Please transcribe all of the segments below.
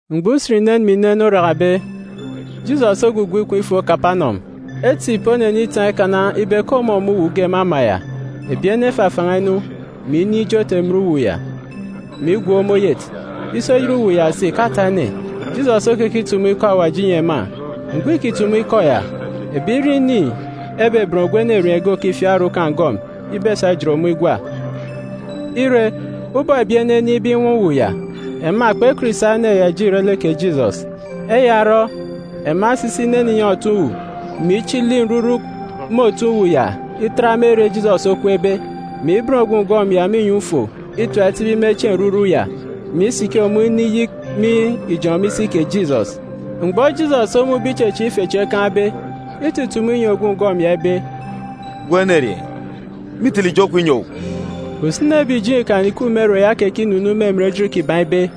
Mgbọ usen inen mè inen orakabe, Jisọs ogwugwu ikom ifo Kapanọm. Etip onenitaan̄ ikana ibe ke ọmọ me uwu ge me ama ya. Ebi ene efafan̄a inu, mè inin̄ ijot emen uwu ya, mè igwook me oyet, isi oyet uwu ya si ìkata ene. Jisọs okekitumu ikọ Awaji inyi ema. Mgbọ îkitumu ikọ ya, ebirieen̄ ini ebeben ogwu enerieen̄ ge òkifiak orukan̄ ngọm ibesa ijet ọmọ igwa. Ire, ubọk ebi ene enin̄be inwaan̄ uwu ya, ema kpekọt isa ene ya ije ire lek kè Jisọs. Eya orọ, ema esisi inene inyọn̄ otoon̄-uwu ya, mè ichili nruruk me otoon̄-uwu ya itat me ere Jisọs okweekbe, mè iben ogwu ngọm ya me inyọn̄ ufo itap itibi me chieen̄ nruruk ya, mè igele ọmọ isiki iniyik me ijọn̄ me isi kè Jisọs. Mgbọ Jisọs omun̄be ichechieek ife chi ekaan̄be, itutumu inyi ogwu ngọm ya ibe, “Gwun̄ enerieen̄, mîtele ijo kwun̄ inyi owu.” Usini ebi ìjeen̄ Ikan ìkup me ere ya ekekinunuun̄ me emen ejit kiban̄ ibe,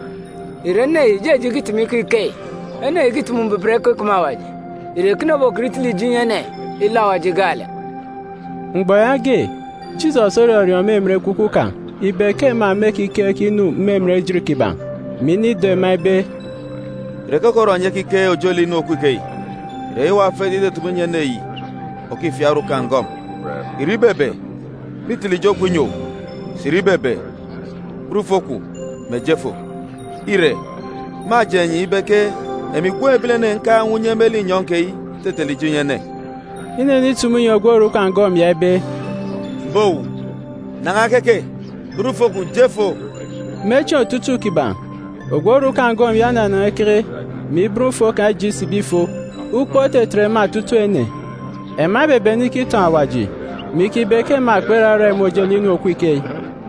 “Ìre ene yi ìjeje ikitumu ikọ ikeyi? Ene yi ìkitumu mbuban ikọ ikeme Awaji. Ìre ekene obokọt itele ijo inyi ene, ilọ Awaji gaalek?” Mgbọ yaage, Jisọs orọriọọn̄ me emen ekwukwu kan̄ ibe ke ema mêkikeek inu yi me emen ejit kiban̄, mè inido ema ibe, “Ìre keke orọ enyi ekikeek ojelek inu òkup ikeyi? Ìre eyi owa ofet itutumu inyi ene yi òkifiak orukan̄ ngọm? Ìre ibebe: Mîtele ijo kwun̄ inyi owu? Sà ìre ibebe: Ben ufo kwun̄, mè je fo? Ire, mâjeen̄ enyi ibe ke emi Gwun̄ Ebilene nkaan̄ unye me linyọn̄ keyi itetele ijo inyi ene.” Inenitumu inyi ogwu orukan̄ ngọm ya ibe, “M̀be owu, nan̄a keke, ben ufo kwun̄ je fo!” Me chieen̄ otutuuk kiban̄, ogwu orukan̄ ngọm ya onanan̄a ikeke mgbọ yaage, mè iben ufo kan̄ ije isibi ifo. Ukpook otetet ema otutuuk ene. Ema ebebene ikitọn̄ Awaji, mè ikibe ke ema kperarak imun̄ ojelek inu òkup ikeyi.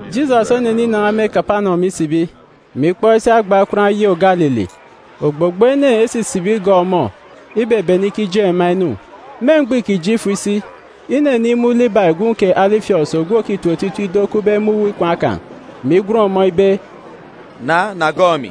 Jisọs oneninan̄a me Kapanọm isibi, mè ikpọk isi agba okwaan̄ oyô Galili. Ogbogbo ene esisibi igọọk ọmọ, ibebene ikijeen̄ ema inu. Me mgbọ îkije ifo isi, inenimun̄ Libai gwun̄ kè Alifiọs ogwu òkibọkọ otitip ido okupbe me uwu ikwaan̄ kan̄, mè igwen ọmọ ibe, “Na, na gọọk emi!”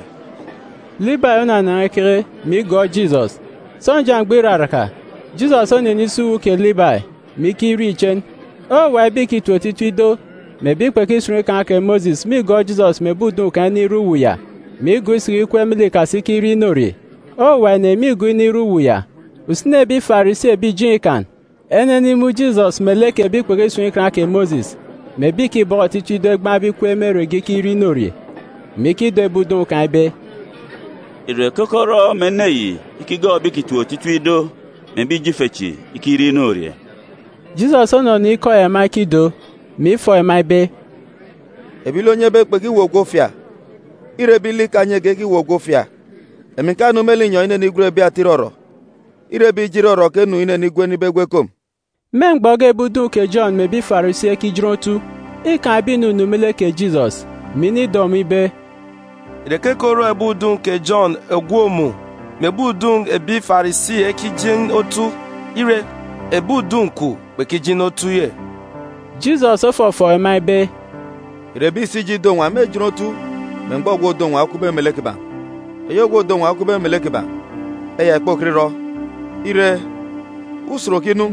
Libai onanan̄a ikeke, mè igọọk Jisọs. Sọnja mgbọ iraraka, Jisọs onenisi uwu kè Libai, mè ikirie ichen. Owuwa ebi ìkitip otitip ido, mè ebi kpekisun̄ Ikan kè Mosis mîgọọk Jisọs mè ebi udun̄ kan̄ inire uwu ya, mè igọọk isiki ikweek me lek ikasi ikirie inorie. Owuwa ene mîgọọk inire uwu ya. Usini ebi ìjeen̄ Ikan ìrere ebi Farisi, enenimun̄ Jisọs melek ebi kpekisun̄ Ikan kè Mosis, mè ebi ìkibọkọ otitip ido egbaan̄be ikweek irek me ere ge ikirie inorie, mè ikido ebi udun̄ kan̄ ibe, “Ìre keke orọ mè ene yi ikigọọk ebi ìkitip otitip ido, mè ebi ijo ife chi igbaan̄ ikweek ikirie inorie?” Jisọs onọnọ ikọ ya ema ekido, mè ifọọk ema ibe, “Ebi lek onyebe kpekiweek ogwu ofia, îre ebi lek ikanyege ekiweek ogwu ofia. Emi ǹkanu me linyọn̄ inenigwen ebi ata irọrọ, îre ebi ijo irọrọ ke nnu inenigwen ibe egwu ekom.” Me mgbọ ge ebi udun̄ kè Jọn mè ebi Farisi ekijin otu, îkaan̄ ebi ìnunu me lek kè Jisọs, mè inido ọmọ ibe, “Ìre keke orọ ebi udun̄ kè Jọn ògwook mun̄ mè ebi udun̄ ebi Farisi ekijin otu, ire, ebi udun̄ kwun̄ kpekijin otu?” Jisọs ofọfọọk ema ibe, “Ìre ebi ìsi ijọk ido-nwa mêjin otu me mgbọ ogwu òdo nwa okupbe melek kiban̄? Eyi ogwu òdo nwa okupbe melek kiban̄, eya ìkpokọt irọ. Ire, usen òkinu,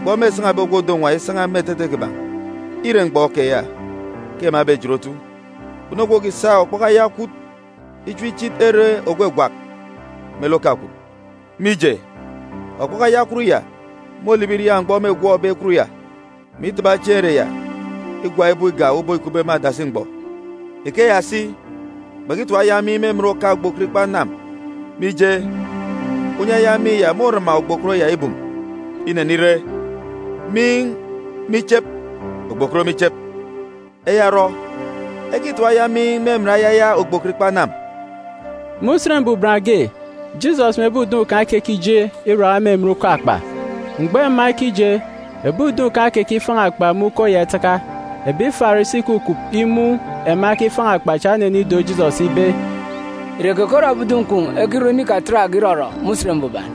mgbọ mêsan̄abe ogwu òdo nwa isan̄a me etete kiban̄. Îre mgbọ keya ke ema ebejin otu. Kpunu ogwu òkisa okpọkọ aya ekwut ichim ichit ere ògwagwak me lek oka ekwut, mije, okpọkọ aya ekwut ya môlibi iriaak mgbọ mêgwọkbe ekwut ya, mè itaba chieen̄ ere ya igwak ibook igak ubọk îkupbe me adasi mgbọ. Ikeya si, kpekitap aya miin̄ me emen oka ogbokot ikpa anam, mije, unye aya miin̄ ya môrama ogbokot ya ibum. Mônenire, miin̄ me ichep, ogbokot me ichep. Eya orọ, ekitap aya miin̄ me emen ayaya ogbokot ikpa anam.” Me Usen Mbuban ge, Jisọs mè ebi udun̄ kan̄ ekekije iraka me emen uko akpa. Mgbọ ema ekije, ebi udun̄ kan̄ ekekifan̄a akpa me uko ya itaka. Ebi Farisi ìkukup imun̄ ema ekifaan̄ akpa cha enenido Jisọs ibe, “Ìre keke orọ ebi udun̄ kwun̄ ekirọ inu Ikan obe ekarọ me Usen Mbuban?”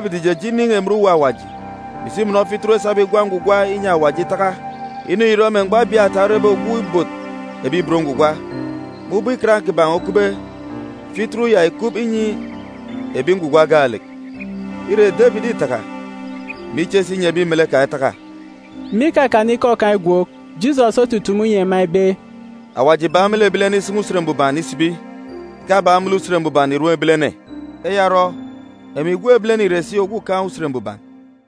Debit ìjeje inin̄ emen Uwu Awaji, mè isi imọnọ fituru esabe igwa ngwugwa inyi Awaji itaka. Inu yi ìrọ me mgbọ Abiata orebe ogwu òban Awaji. Me ubọk ikan kiban̄ okupbe, fituru ya ìkup inyi ebi ngwugwa gaalek. Ire, Debit îtaka, mè iche si inyi ebi melek kan̄ etaka.” Me ikakana ikọ kan̄ igwook, Jisọs otutumu inyi ema ibe, “Awaji ìbak me lek ebilene isan̄a Usen Mbuban isibi, ìkabak me lek Usen Mbuban ìrom ebilene. Eya orọ, emi Gwun̄ Ebilene ìre si Ogwukaan̄ Usen Mbuban.”